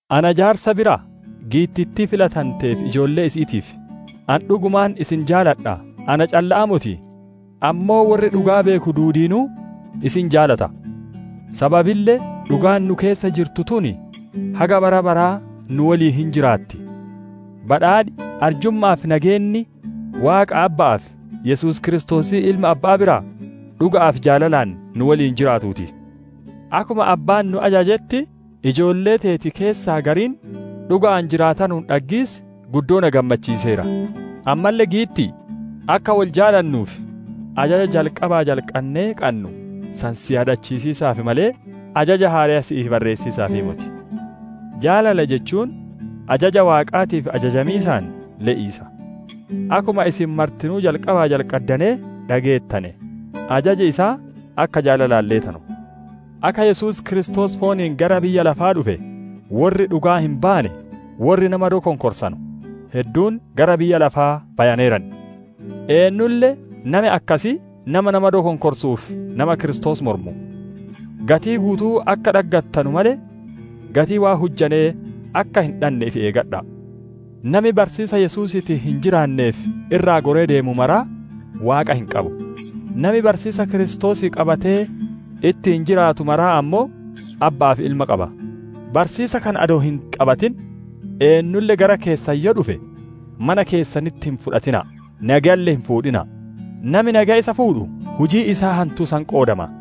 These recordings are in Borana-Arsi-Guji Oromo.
Ana jaarsa biraa, giittittii filatantee fi ijoollee isi'iitiif: Ani dhugumaan isin jaaladha, na calla'aa moti, ammoo worri dhugaa beeku duudiinuu isin jaalata. Sababille dhugaan nu keessa jirtu tun haga bara baraa nu woliin hin jiraatti. Badhaadhi, arjumma'aa fi nageenni, Waaqa Abba'aa fi Yesuus Kiristoosii Ilma Abba'aa biraa, dhuga'aa fi jaalalaan nu woliin jiraatuu ti. Akkuma Abbaan nu ajajetti, ijoollee teeti keessaa gariin dhuga'aan jiraatanuun dhaggiis guddoo na gammachiiseera. Ammalle giitti'i! Akka wol jaalannuuf, ajaja jalqabaa jalqannee qannu san si yaadachiisiisaaf malee, ajaja haareya si'iif barreessiisaaf moti. Jaalala jechuun ajaja Waaqaatiif ajajamiisaan le'iisa. Akkuma isin martinuu jalqabaa jalqaddanee dhageettane, ajaji isaa akka jaalalaan leetanu. Akka Yesuus Kiristoos fooniin gara biyya lafaa dhufe worri dhugaa hin baanne, worri nama dokonkorsanu hedduun gara biyya lafaa bayaneeran. Eennulle nami akkasii nama nama dokonkorsuu fi nama Kiristoos mormu. Gatii guutuu akka dhaggattanu malee, gatii waan hujjanee akka hin dhanne ifi eeggadha'a! Nami barsiisa Yesuusiitiin hin jiraannee fi irraa goree deemu mara Waaqa hin qabu; nami barsiisa Kiristoosii qabatee ittiin jiraatu mara ammoo Abba'aa fi Ilma qaba. Barsiisa kana adoo hin qabatin eennulle gara keessan yoo dhufe, mana keessanitti isa hin fudhatina'a! Nageyalle hin fuudhina'a! Nami nageya isa fuudhu, hujii isaa hantuu san qoodama.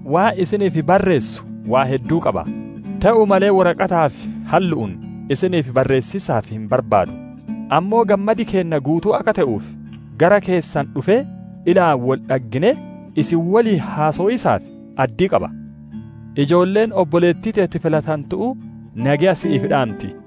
Waan isiniif barreessu waan hedduu qaba; te'uu malee woraqataa fi hallu'uun isiniif barreessiisaaf hin barbaadu; ammoo gammadi keenna guutuu akka te'uuf, gara keessan dhufee ilaan wol dhagginee, isin woliin haasowiisaaf addii qaba. Ijoolleen obboleettii teeti filatantu'uu nageya si'iif dhaanti.